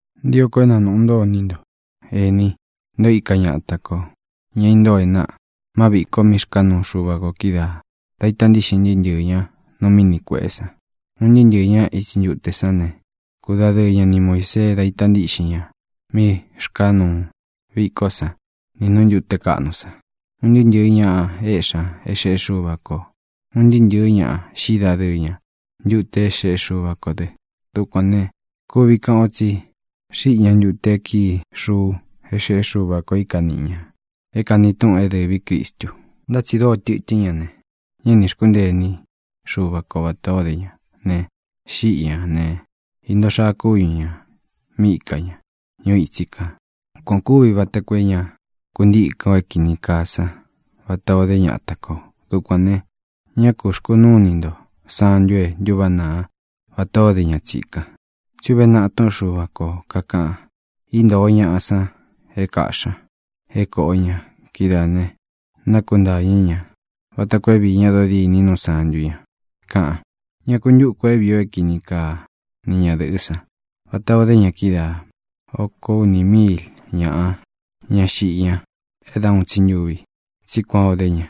Ntio ko é na nūꞌu ntó iní nto, ēní, nté ō íka ñata kō, ña intóo e náꞌa, má viko mí xkāá nuu Xuva kō kídaā da ita ntíꞌxin ntɨɨ́ ntɨɨ̄ ña nu Míni Kuēꞌé san. Un ntɨɨ́ ntɨɨ̄ ña itsi ntute sán ne, kudadɨɨ ña ni Muīsee da ita ntíꞌxin ña mí rkāa nuu vikó san nī nú ntūte kaꞌnu san. Un ntɨɨ́ ntɨɨ̄ ña éꞌxi ña é xeꞌé Xuva kō. Un ntɨɨ́ ntɨɨ̄ ña xíꞌi dadɨɨ ña ntute é xeꞌé Xuva kō dɨ. Dukuān ne, kuvi kaꞌan o tsí xiꞌi ña ntute e kíi xuu é xeꞌé Xuva kō é ika niꞌi ñā, é kāni túꞌun é dɨvī Cristu. Ntá tsi dóo tɨtɨ́n ña ne, ñá nī xkúntee iní Xuva ko vatā o dé ña ne, xíꞌi ñā ne, íntōo xaa kúñu ñā mí ika ña ñuu itsí kān. Kuan ō kúvi vata koo é ña kuntíkɨn ō é kīni kaa sán vatā o dé ñata kō. Dukuān ne, ñá ku xkunúu ini nto santu e ntúváꞌa naa vatā o dé ña tsikan. Tsí uve naꞌa túꞌun Xuva kō, kakaꞌan: “Íntōo ñaꞌa san é kāꞌxi ña, é kōꞌo ña. Kidáā ne, nákuntañɨ̄ ña vata koo é viī ñá dodîní nu sántu ña”, kaꞌan. Ñá ku ntuku ō é vīi o é kini kaa ni ñadɨ̄ꞌɨ́ san vatā o dé ña kídaā. Oko uni míil ñaꞌa ña xíꞌi ña é da uun tsi ntuvi, tsí kuan ō dé ña.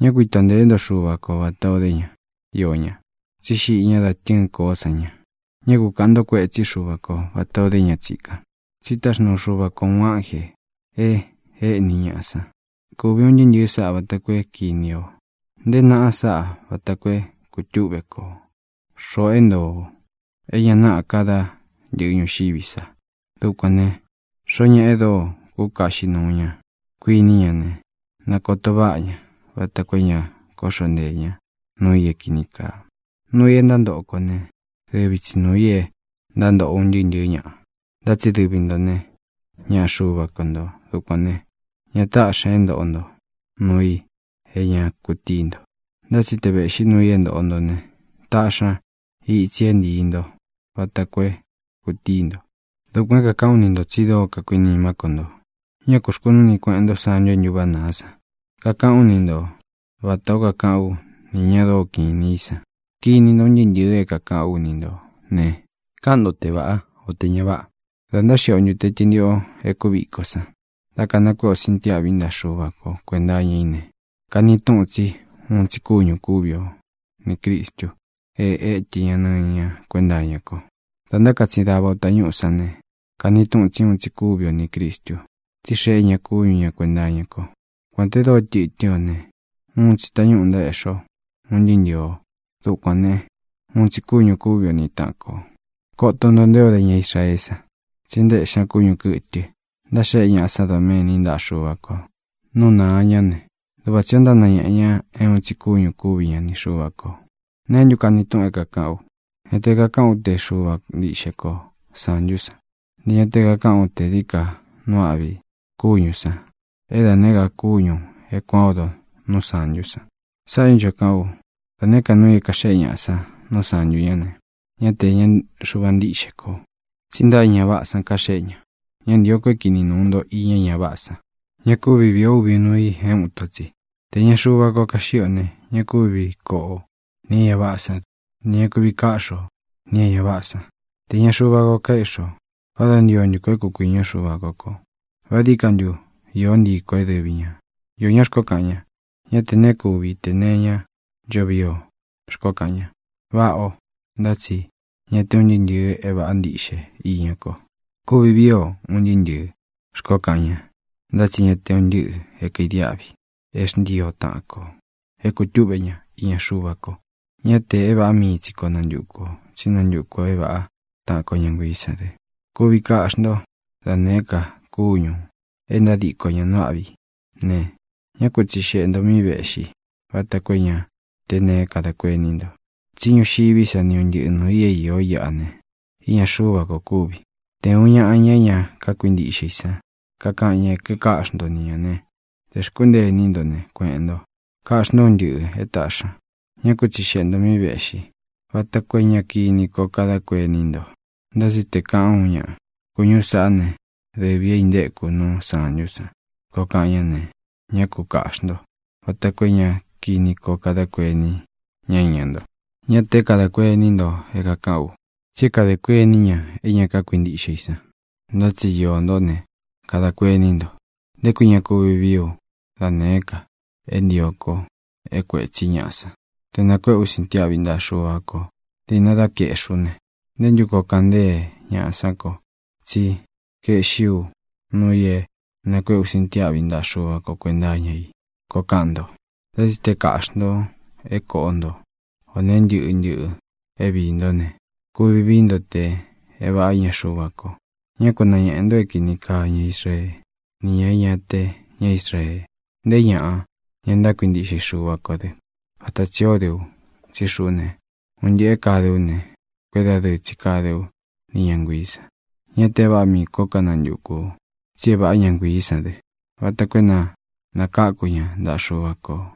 Ñá ku ito ntēé nto Xuva ko vatā o dé ña, iō ña, tsí xiꞌi ña da tɨ́ɨn koó san ña. Ñá ku kāꞌan nto kuétsi Xuva ko vatā o dé ña tsikan, tsí táxnuu Xuva ko ūun ánjē e éꞌni ñaꞌa san. Kuvi un ntɨꞌɨ sāꞌá vata koo é kīni o. Nteé naꞌa sáꞌa vata koo é kūtúꞌve ko, xoꞌō é ntoo o é ña naꞌá ka dá ntɨ̄ꞌɨ ñuxiví sa. Dukuān ne, xoo ñáꞌa e dóo kúkaꞌxi nuu ña, kuiní ña ne, na kōto váꞌa ña vata koo é ña kóꞌxo nteē ña núu i é kīni kaa. Nuu i é ntántoꞌo kō né, dɨvi tsi nuū i é ntántoꞌo un ntɨɨ́ ntɨ̄ɨ́ ñaꞌa, ntá tsi dɨvi nto ne, ñaꞌa Xuva ko ntō. Dukuān né, ña táꞌxi ña é ntoꞌo nto nuu i é ña kutíi nto. Ntá tsi te vēꞌxi nuu i é ntoꞌo nto ne, taꞌxi ña itsi é ntīi nto vata koo é kūtíi nto. Dukuān é kākaꞌán u ni ntō, tsi dóo kakuinimá ko nto. Ñá kū xkunúu ini kueꞌen nto santu e ntúváꞌa nāá san. Kakaꞌán u ni nto vatā ó kakaꞌán u ni ñāꞌa dóo kinī í san. Kini nto un ntɨɨ́ ntɨ̄ɨ é kākaꞌán u ni ntō ne, káꞌan nto te vāꞌá, o tē ña váꞌa. Da ntáxiꞌi o ntute tɨntiꞌo é kúviko san, da kanakuéꞌe o sintiáꞌvi ntaꞌa Xuva ko kuēnta iña i ne, kani túꞌun tsí uun tsi kúñū kúvi o nī Cristu e étɨ ña nɨñɨ ña kuénta iña ko. Dā ntákatsin dava o tañúꞌū sán ne, kani túꞌun tsí uun tsi kúvi o nī Cristu, tsí xeꞌé ña kúñu ña kuēnta iña ko. Kuān te dóo tɨtɨ́n ō ne, uun tsi tañúꞌū ntaéꞌxi o un ntɨɨ́ ntɨɨ ō. Dukuān né, uun tsi kúñū kúvi o ni tāꞌan ko. Koto nto nté o de ña Israeé san. Tsí ntaéꞌxi ña kúñu kɨ̄tɨ ntáxeꞌe ñaꞌa sán doméni ntaꞌa Xuva kō nú nāa ñá ne, duꞌva tsī o ntánañeꞌe ña é uun tsi kúñū kúvi ña ni Xuva kō. ¿Neé ntu kani túꞌun é kākaꞌán u? Ñá te kakāꞌán u te Xuva ntiꞌxe ko sāntú san; ntē ña te kakaꞌán u te dií ka nuu áꞌvi kúñū san é da nēé ka kúñū é kuān o ódo nu sántú san. Sáꞌā é ncho kaꞌán u: Da nēé ka nuu i é kāxéꞌe ñaꞌa san nu sántu ñá ne, ñá te īña Xuva ntíꞌxe kō, tsí ntaꞌa é ña váꞌā san kaxéꞌe ña. Ñá ntīo ko é kini nūu nto iña é ña váꞌā san. Ña kúvi viī o úvi nuu i é uun ito tsi. Te īña Xuva ko kaxíꞌi o ne, ña kúvi koꞌo o nī é ña váꞌā sán dɨ. Ntē ña kuvi káꞌxi o nī é ña váꞌā sán te īña Xuva ko kaeꞌxi o. ¿Vá da ntio ntu kō é kukuīñú Xuva ko kō? ¿Vá dií ka ntu īó ntii kō é dɨvi ñā? Īó ñaꞌa xkoó kaꞌan ña: “Ña te neé kuvi tē nee iñá ncho vii o”, xkoó kaꞌan ña. Váꞌā ó, ntá tsi ñá te un ntɨɨ́ ntɨ̄ɨ é vāꞌa ntiꞌxe iña ko. “Kuvi vii o un ntɨɨ́ ntɨ̄ɨ”, xkoó kaꞌan ña, ntá tsi ña te un ntɨ́ꞌɨ é kaidiáꞌvi é xntii o taꞌan kō é kutúꞌve ña iña Xuva ko. Ñá tē é vāꞌá mii tsi kō nantúku ō, tsí nantuku ō é vāꞌá taꞌan ko ñá nguiī sán dɨ. Kuvi kaꞌxi ntó da nēé ka kúñū e ntádiko ña nuu âꞌví i ne, ñá ku tsixeꞌe ntō mí vēꞌxi, vata koo é ña té neé kadā kuení nto. Tsí ñuxiví sa ni un ntɨꞌɨ nūu i é īó iꞌa ne, iña Xuva ko kúvi. Te ūún ñaꞌa, ña é ña kákuintiꞌxe i san, kakaꞌan ña é kikáꞌxi nto ni ñā ne, tē xkúntee iní nto ne, kueꞌēn nto. Kaꞌxi ntó un ntɨꞌɨ̄ é taꞌxī ña. Ñá ku tsixeꞌe ntō mí vēꞌxi, vata koo é ña kini koo kadá kuení nto. Ntá tsi te kāꞌan uun ñaꞌa: “Kūñú sāꞌá ne, dɨvī é intéku nu sántú san”, koo kaꞌan ñá ne, ñá ku kāꞌxi nto, vata koo é ña kini koo kadá kuení ña iña nto. Ñá tē é kadā kuení nto é kākaꞌán u, tsí é kadē kuení ña é ña kákuintiꞌxe i san. Ntá tsi iō ntó ne, kadā kuení nto: “¿Nté kui ña kuvi vīí u da nēé ka é ntio ko é kuētsí ñaꞌa san? Te nakuēꞌe u sintiáꞌvi ntaꞌa Xuva ko dīꞌna dá kaeꞌxi ú ne, ¿nté ntu koo kaꞌan ntée ñaꞌa sán ko tsí kaeꞌxi u nuu i e nakueꞌe ú sintiáꞌvi ntaꞌa Xuva ko kuēnta iña i?”, koo kaꞌan nto. Ntá tsi te kāꞌxi ntó, te kōꞌo ntó, ō nee ntɨ́ꞌɨ ntɨꞌɨ é viī ntó ne, kuvi vií nto te é vāꞌá iña Xuva ko. Ñá ku nañēꞌe nto é kīni kaa ña Israee, ni ña e ña te ña Israee, nté ñāꞌa, ña ntákuintiꞌxe i Xúva kō dɨ. Vata tsī ó de u. Tsí xuꞌú ne, un ntɨꞌɨ̄ é kāde ú ne, kuédadɨɨ tsi káde ú ni ña nguiī san. Ñá te é vāꞌá mii ko kanantukū u, tsí é vāꞌá ña nguiī sán dɨ, vata koo é na nākáku ña ntaꞌa Xuva kō.